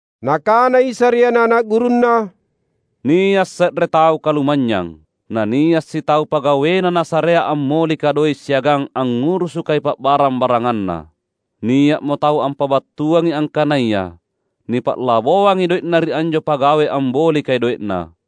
Nakana Isa ri ana’-ana’ gurunNa, "Nia’ se’re tau kalumanynyang. Na nia’ sitau pagawena nasarea ammolika doe’ siagang angngurusukai pa’barang-baranganna. Nia’mo tau ampabattuangi angkanaya nipa’laboangi doe’na ri anjo pagawe ambolikai doe’na.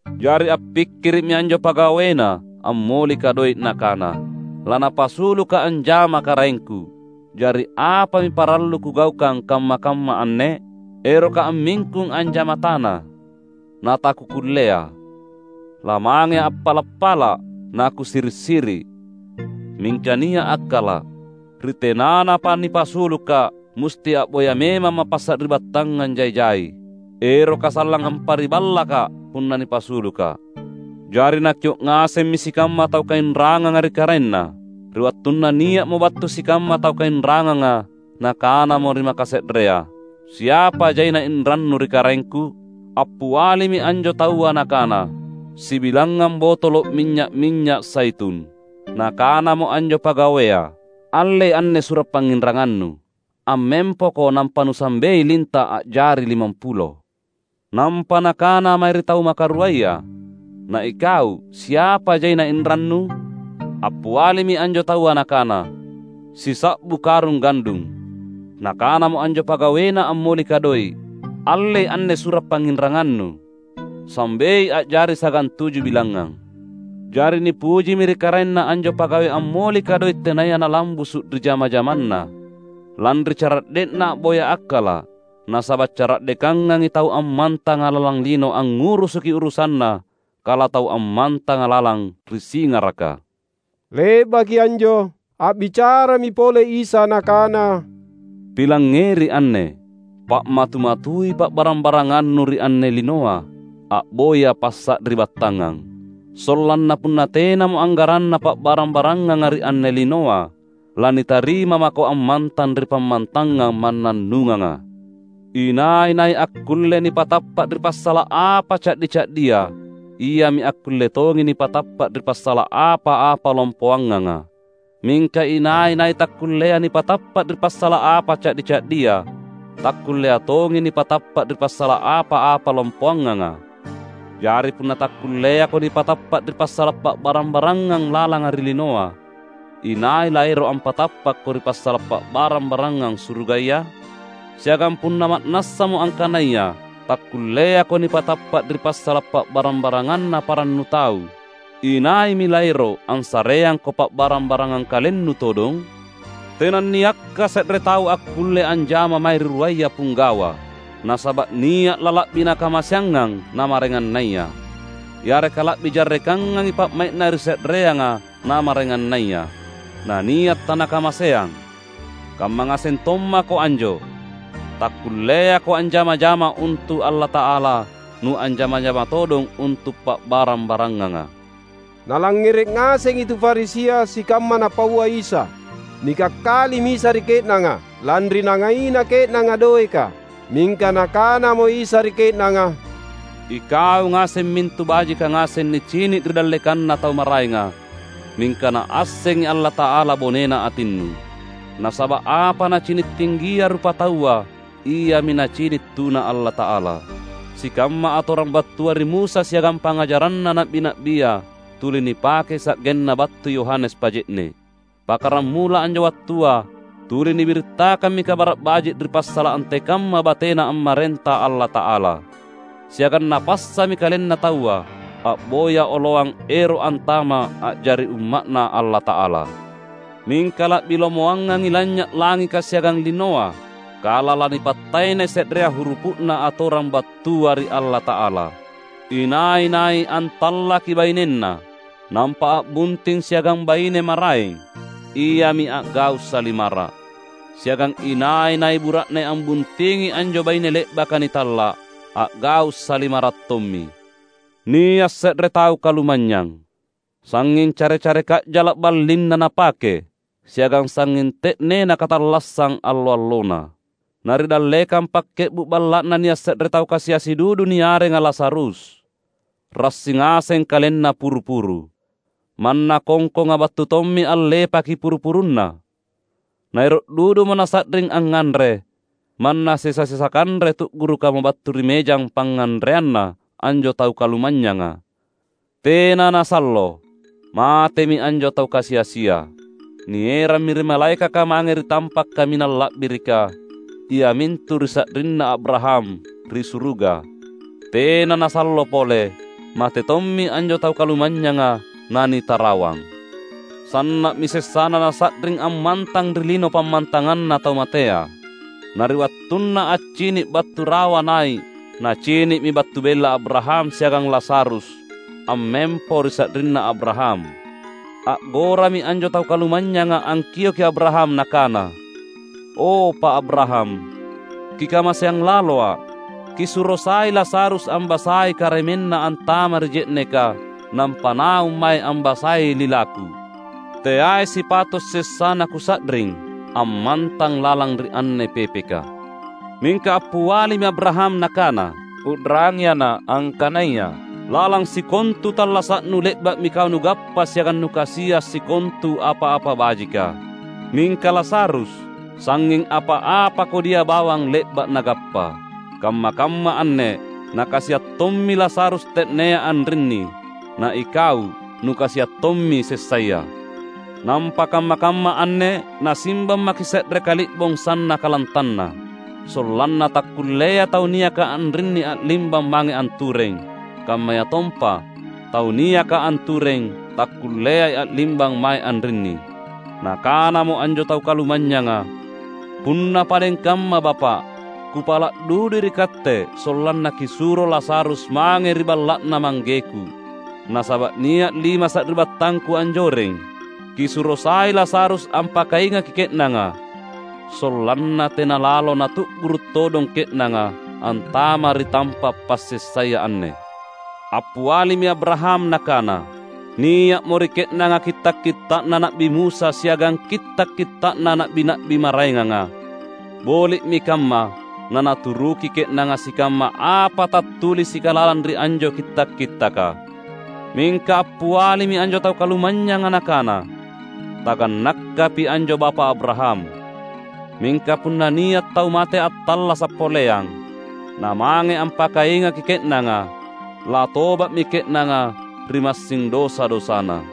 Jari appikkiri’mi anjo pagawena ammolika doe’ nakana, ‘Lanapasulukka’ anjama karaengku. Jari apami parallu kugaukang kamma-kamma anne? Erokka’ ammingkung anjama tana, natakukullea; lamangea’ appala’-pala’, nakusiri’-siri’. Mingka nia’ akkala’, ri tenanapa nipasulukka’, musti a’boya memamma’ passari’battangang jai-jai, eroka sallang ampariballakka’ punna nipasulukka’!’ Jari nakio’ ngasemmi sikamma tau kainranganga ri karaenna. Ri wattunna nia’mo battu sikamma tau kainranganga nakanamo ri makase’rea, ‘Siapa jaina inrannu ri karaengku?’ Appialimi anjo taua nakana, ‘Sibilangngang botolo’ minynya’-minynya’ zaitun.’ Nakanamo anjo pagawea, ‘Allei anne sura’ pangnginrangannu. Ammempoko nampa nusambei linta’ a’jari limampulo.’ Nampa nakana mae ri tau makaruaya, ‘Na ikau siapa jaina inrannu?’ Appialimi anjo taua nakana, ‘Sisa’bu karung gandung.’ Nakanamo anjo pagawena ammolika doe’, ‘Allei anne sura’ pangnginrangannu. Sambei a’jari sagantuju bilangngang.’ Jari nipujimi ri karaenna anjo pagawe ammolika doe’ tenaya nalambusu’ ri jama-jamanna, lanri cara’de’na a’boya akkala’. Nasaba’ cara’dekangangi tau ammantanga lalang lino angngurusuki urusanna kala tau ammantanga lalang ri singaraka." Le’baki anjo, a’bicarami pole Isa Nakana, "Pilangngeri anne! Pa’matu-matui pa’barang-barangannu ri anne linoa a’boya passari’battangang, sollanna punna tenamo anggaranna pa’barang-baranganga ri anne linoa, lanitarima mako ammantang ri pammantangang mannannunganga. Inai-nai akkulle nipatappa’ ri passala’ apa ca’di-ca’dia iami akkulle tongi nipatappa’ ri passala’ apa-apa lompoanganga. Mingka inai-nai takkullea nipatappa’ ri passala’ apa ca’di-ca’dia, takkullea tongi nipatappa’ ri passala’ apa-apa lompoanganga. Jari punna takkulleako nipatappa’ ri passala’ pa’barang-barangang lalanga ri linoa, inai laero’ ampatappakko ri passala’ pa’barang-barangang surugaya? Siagang punna ma’nassamo angkanaya takkulleako nipatappa’ ri passala’ pa’barang-baranganna parannu tau, inaimi laero’ assareangko pa’barang-barangang kalennu todong? Tenanniakka se’re tau akkulle anjama mae ri ruaya pinggawa; nasaba’ nia’ lala’bi nakamaseangngang na maraengannaya, yareka la’bi jarrekangngangi pa’mai’na ri se’reanga na maraengannaya. Na nia’ tanakamaseang. Kamma ngaseng tommako anjo. Takkulleako anjama-jama untu’ Allata’ala nuanjama-jama todong untu’ pa’barang-baranganga." Nalangngere’ ngasengi tu Farisia sikamma Napaua Isa. Nikakkalimi Isa ri ke’nanga, lanri nangaina ke’nanga doeka. Mingka Nakanamo Isa ri ke’nanga, "Ikau ngaseng mintu bajika ngaseng nicini’ ri dallekanna tau maraenga, mingka Naassengi Allata’ala bonena atinnu. Nasaba’ apa nacini’ tinggia rupataua iami Nacini’ tuna Allata’ala. Sikamma atorang battua ri Musa siagang pangngajaranna na’bi-na’bia tuli nipakei sa’genna battu Yohanes Paje’ne’. Pakkaramula anjo wattua tuli nibirittakammi Kabara’ Baji’ ri passala’ antekamma bateNa ammarenta Allata’ala. Siagang napassami kalenna taua a’boya oloang ero’ antama’ a’jari umma’Na Allata’ala. Mingka la’bi lomoangangi lanynya’ langika siagang linoa kala lanipattaenai se’rea hurupu’na Atorang battua ri Allata’ala. Inai-nai antallaki bainenna, nampa a’bunting siagang baine maraeng, iami a’gau’ salimara’. Siagang inai-nai bura’ne ambuntingi anjo baine le’baka nitalla’, a’gau’ salimara’ tommi." "Nia’ se’re tau kalumanynyang. Sangnging care-care ka’jala’ ballinna napake, siagang sangnging te’nena katallassang allo-allona. Na ri dallekang pakke’bu’ balla’na nia’ se’re tau kasi-asi dudu niarenga Lazarus. Rassi ngaseng kalenna puru-puru. Manna kongkonga battu tommi allepaki puru-puruna. Naero’ dudumo nasa’ring angnganre, manna sesa-sesa kanre tu’gurukamo battu ri mejang pangnganreanna anjo tau kalumanynyanga. Tena nasallo, matemi anjo tau kasi-asia. Nierammi ri malaekaka mange ri tampa’ kaminang la’birika, iamintu ri sa’rinna Abraham ri suruga. Tena nasallo pole, mate tommi anjo tau kalumanynyanga nanitarawang. Sanna’mi sessana nasa’ring ammantang ri lino pammantanganna tau matea. Na ri wattunna accini’ battu rawa nai’ nacini’mi battu bella Abraham siagang Lazarus ammempo ri sa’rinna Abraham. A’gorami anjo tau kalumanynyanga angkioki Abraham nakana, ‘O, Pa’ Abraham! Kikamaseang laloa’. Kisuro sai Lazarus ambasai karemenna antama’ ri je’neka nampa naung mae ambassai lilaku. Teai sipato’ sessana kusa’ring ammantang lalang ri anne pepeka!’ Mingka appialimi Abraham nakana, ‘U’rangi ana’ angkanaya: lalang sikontu tallasa’nu le’ba’mi kau nugappa siagang nukasia’ sikontu apa-apa bajika; mingka Lazarus sangnging apa-apa kodia bawang le’ba’ nagappa. Kamma-kamma anne nakasia’ tommi Lazarus te’nea anrinni, na ikau nukasia’ tommi sessaya. Nampa kamma-kamma anne nasimbang maki’ se’re kali’bong sannaka lantanna, sollanna takkullea tau niaka anrinni a’limbang mange antureng, kammayatompa tau niaka antureng takkulleai a’limbang mae anrinni!’ Nakanamo anjo tau kalumanynyanga, ‘Punna padeng kamma bapa’, kupala’ dudui ri katte sollanna kisuro Lazarus mange ri balla’na manggeku. Nasaba’ nia’ lima sari’battangku anjoreng. Kisuro sai Lazarus ampakaingaki ke’nanga, sollanna tena lalo natu’guru’ todong ke’nanga antama’ ri tampa’ passessaya anne.’ Appialimi Abraham nakana, ‘Nia’mo ri ke’nanga kitta’-kitta’na Na’bi Musa siagang kitta’-kitta’na na’bi-na’bi maraenganga! Boli’mi kamma nanaturuki ke’nanga sikamma apa tattulisika lalang ri anjo kitta’-kittaka!’ Mingka appialimi anjo tau kalumanynyanga nakana, ‘Tagannakapi anjo Bapa’ Abraham. Mingka punna nia’ tau mate attallasa’ poleang, na mange ampakaingaki ke’nanga, latoba’mi ke’nanga ri massing dosa-dosana.’